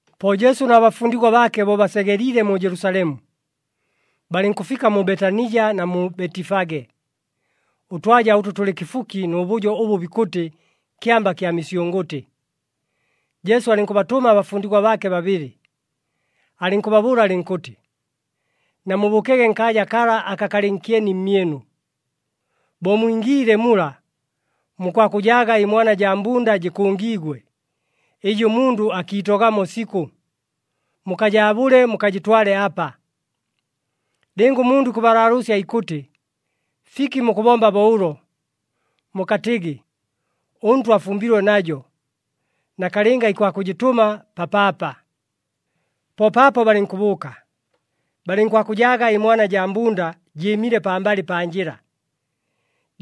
Po Jesu na bafundigwa baake bo basegeliile mu Jelusalemu, balɨnkʉfika mu Betanija na mu Betifage, ʉtwaja ʉtʉ tʉlɨ kɨfuki nʉ bʉjo ʉbʉ bikʉtɨ Kyamba kya Misyʉngʉtɨ. Jesu alɨnkʉbatʉma abafundigwa baake babɨlɨ, alɨnkʉbabʉʉla alɨnkʉtɨ, “Namubʉʉkege nkaaja kala aka kalɨ nkyeni mmyɨnu. Bo mwingiile mula, mukwakʉjaaga ɨmwana jaa mbunda jɨkʉngiigwe, ɨjɨ ʉmundʉ akiitogamo sikʉ. Mukajaabʉle, mukajɨtwale apa. Lɨnga ʉmundʉ ikʉbalaalʉʉsya ikʉtɨ, ‘Fiki mukʉbomba bo ʉlo?’ mukatɨgɨ, ‘ɄNtwa afumbilwe najo, nakalɨnga ikwakʉjɨtʉma papaapa.’” Po paapo balɨnkʉbʉʉka, balɨnkwakʉjaaga ɨmwana jaa mbunda jɨɨmile pambalɨ pa njɨla,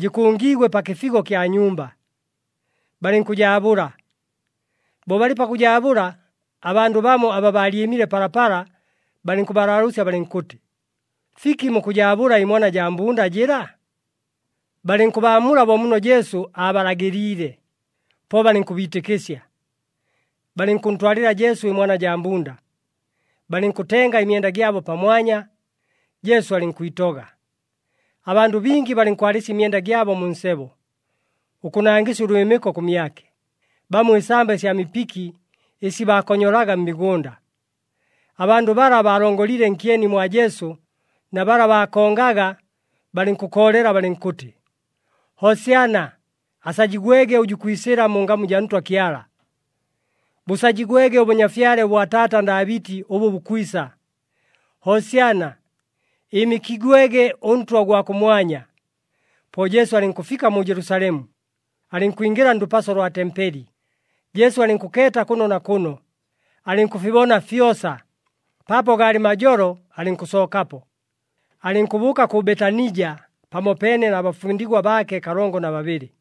jɨkʉngiigwe pa kɨfigo kya nyumba, balɨnkʉjaabʉla. Bo balɨ pakʉjaabʉla, abandʉ bamo aba baalyɨmile palapala, balɨnkʉbalaalʉʉsya balɨnkʉtɨ, “Fiki mukʉjaabʉla ɨmwana jaa mbunda jɨla?” Balɨnkʉbaamula bo muno Jesu aabalagɨliile, po balɨnkʉbiitɨkɨsya. Balɨnkʉntwalɨla Jesu ɨmwana jaa mbunda, balɨnkʉtenga ɨmyenda gyabo pamwanya, Jesu alɨnkwitoga. Abandʉ bingi balɨnkwalɨsya ɨmyenda gyabo mu nsebo, ʉkʉnangɨsya ʉlwɨmɨko kʉmyake, bamo ɨsamba ɨsya mipiki ɨsi baakonyolaga mmigʉnda. Abandʉ bala baalongoliile nkyeni mwa Jesu na bala baakongaga balɨnkʉkoolela balɨnkʉtɨ, “Hosyana! Asajigwege ʉjʉ ikwisɨla mu ngamu jaa Ntwa Kyala! Bʉsajigwege ʉbʉnyafyale ʉbwa taata Ndaabɨti ʉbʉ bukwisa. Hosyana! Ɨɨmɨkigwege ʉNtwa ʉgwa kʉmwanya!” Po Jesu alɨnkʉfika mu Jelusalemu, alɨnkwingɨla ndʉpaso lwa tempeli, Jesu alɨnkʉkeeta kʉno na kʉno, alɨnkʉfibona fyosa. Paapo gaalɨ majolo alɨnkʉsookapo, alɨnkʉbʉʉka kʉ Betanija pamopeene na bafundigwa baake kalongo na babɨlɨ.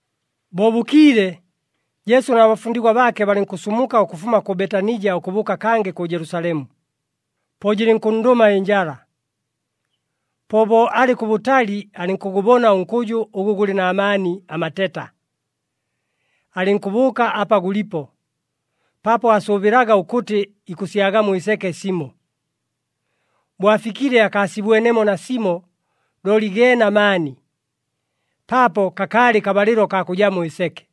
Bo bʉkiile, Jesu na bafundigwa baake balɨnkʉsumuka ʉkʉfuma kʉ Betanija ʉkʉbʉʉka kangɨ kʉ Jelusalemu, po jɨlɨnkʉnndʉma ɨnjala. Po bo alɨ kʉbʉtali alɨnkʉgʉbona ʉnkʉjʉ ʉgʉ gʉlɨ na maani amateta, alɨnkʉbʉʉka apa gʉlipo, paapo aasʉʉbɨlaga ʉkʉtɨ ikʉsyagamo ɨseke simo. Bo afikile akaasibwenemo nasimo looli geene amaani, paapo kakaalɨ kabalɨlo kaa kʉjamo ɨseke.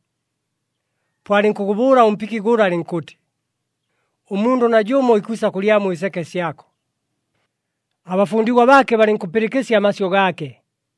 Po alɨnkʉgʉbʉʉla ʉmpiki gʉla alɨnkʉtɨ, “Ʉmundʉ najʉmo ikwisa kʉlyamo ɨseke syako.” Abafundigwa baake balɨnkʉpɨlɨkɨsya amasyʉ gaake.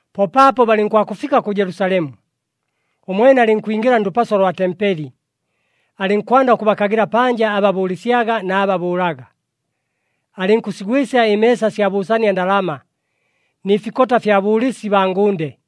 Po paapo balɨnkwakʉfika kʉ Jelusalemu, ʉmwene alɨnkwingɨla ndʉpaso lwa tempeli. Alɨnkwanda ʉkʉbakagɨla panja aba bʉʉlɨsyaga na aba bʉʉlaga. Alɨnkʉsigwɨsya ɨmeesa sya bʉʉsania ndalama, nɨ fikota fya bʉʉlɨsi baa ngʉnde.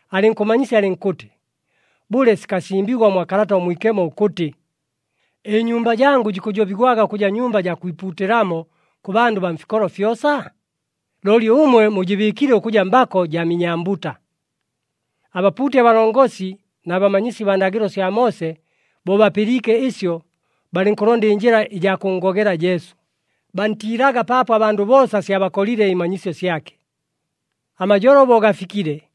Alɨnkʉmanyisya alɨnkʉtɨ, “Bʉle, sikasimbigwa mwa Kalata ʉMwikemo ʉkʉtɨ, ‘Ɨnyumba jangʉ jikʉjobigwaga ʉkʉja nyumba jaa kwipuutɨlamo kʉ bandʉ baa mfikolo fyosa’? Looli ʉmwe mujɨbɨɨkile ʉkʉja, ‘Mbako jaa minyambuta.’” Abapuuti abalongosi na bamanyisi baa ndagɨlo sya Moose bo bapɨliike ɨsyo, balɨnkʉlonda ɨnjɨla ɨjaa kʉnngogela Jesu, bantiilaga paapo abandʉ boosa syabakolile ɨmanyisyo syake. Amajolo bo gafikile,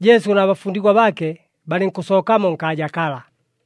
Jesu na bafundigwa baake balɨnkʉsookamo nkaaja kala.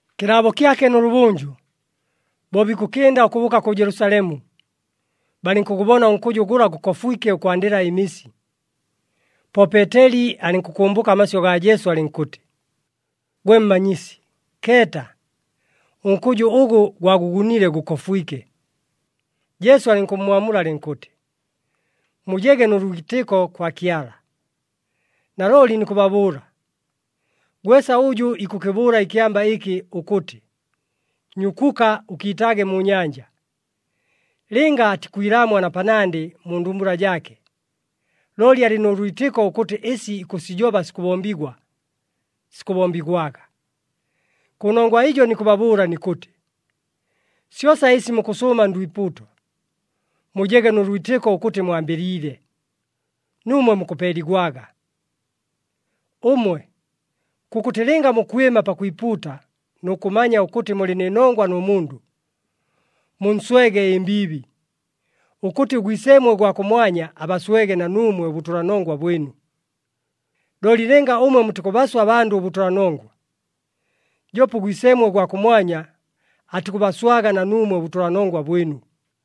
Kɨlaabo kyake nʉlʉbʉnjʉ, bo bikʉkɨnda ʉkʉbʉʉka kʉ Jelusalemu, balɨnkʉgʉbona ʉnkʉjʉ gʉla gʉkofwike ʉkwandɨla ɨmisi. Po Peeteli alɨnkʉkʉmbʉka amasyʉ gaa Jesu, alɨnkʉtɨ, “Gwe Mmanyisi, keeta! Ʉnkʉjʉ ʉgʉ gwagʉgunile gʉkofwike!” Jesu alɨnkʉmmwamula alɨnkʉtɨ, “Mujege nʉ lwitɨko kwa Kyala. Nalooli nikʉbabʉʉla, gwesa ʉjʉ ikʉkɨbʉʉla ɨkyamba ɨkɨ ʉkʉtɨ, ‘Nyukuka, ʉkiitaage mu nyanja,’ lɨnga atikwilaamwa na panandɨ mu ndumbula jaake, looli alɨ nʉ lwitɨko ʉkʉtɨ ɨsi ikʉsijoba sikʉbombigwa, sikʉbombigwaga. Kʉnongwa ɨjo nikʉbabʉʉla nikʉtɨ, syosa ɨsi mukʉsʉʉma ndwipuuto, mujege nʉ lwitɨko ʉkʉtɨ mwambɨliile, nuumwe mukʉpeeligwaga. Ʉmwe, kʉkʉtɨ lɨnga mukwɨma pakwipuuta nʉ kʉmanya ʉkʉtɨ mulɨ nɨ nongwa nʉ mundʉ, munswege ɨmbiibi, ʉkʉtɨ ʉGwiseemwe ʉgwa kʉmwanya abaswege na nuumwe ʉbʉtʉlanongwa bwɨnu. [ Looli lɨnga ʉmwe mutikʉbaswa abandʉ ʉbʉtʉlanongwa, joope ʉGwiseemwe ʉgwa kʉmwanya atikʉbaswaga na nuumwe ʉbʉtʉlanongwa bwɨnu.]”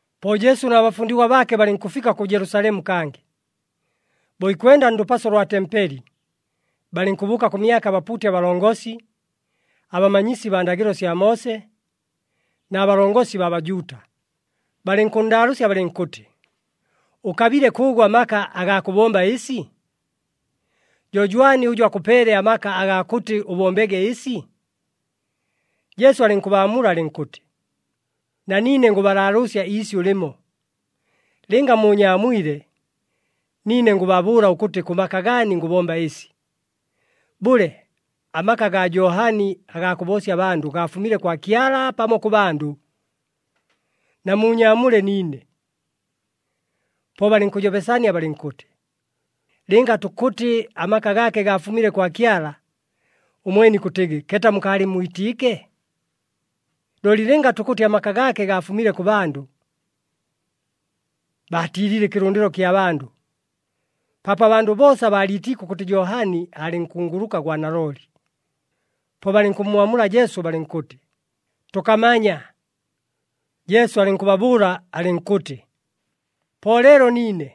Po Jesu na bafundigwa baake balɨnkʉfika kʉ Jelusalemu kangɨ. Bo ikwenda ndʉpaso lwa tempeli, balɨnkʉbʉʉka kʉmyake abapuuti abalongosi, abamanyisi baa ndagɨlo sya Moose na balongosi baa Bajuuta, balɨnkʉnndaalʉʉsya balɨnkʉtɨ, “Ʉkabile kʉʉgʉ amaka agaa kʉbomba ɨsi? Jo jwani ʉjʉ akʉpeele amaka agaa kʉtɨ ʉbombege ɨsi?” Jesu alɨnkʉbaamula alɨnkʉtɨ, “Na niine ngʉbalaalʉʉsya iisyʉ lɨmo. Lɨnga muunyaamwile, niine ngʉbabʉʉla ʉkʉtɨ kʉ maka gaani ngʉbomba ɨsi. Bʉle, amaka agaa Johani agaa kʉboosya abandʉ gaafumile kwa Kyala, pamo kʉ bandʉ? Namuunyaamule niine.” Po balɨnkʉjobesania balɨnkʉtɨ, “Lɨnga tukʉtɨ amaka gaake gaafumile kwa Kyala, ʉmwene ikʉtɨgɨ, ‘Keeta mukaalɨmmwitiike?’ Looli lɨnga tukʉtɨ amaka gaake gaafumile kʉ bandʉ...” (Baatiilile ɨkɨlʉndɨlo kya bandʉ, paapo abandʉ boosa baaliitiike ʉkʉtɨ Johani aalɨ nkunguluka gwa nalooli.) Po balɨnkʉmmwamula Jesu balɨnkʉtɨ, “Tʉkamanya.” Jesu alɨnkʉbabʉʉla alɨnkʉtɨ, “Po leelo niine,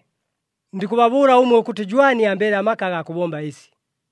ndikʉbabʉʉla ʉmwe ʉkʉtɨ jwani ambeele amaka agaa kʉbomba ɨsi.”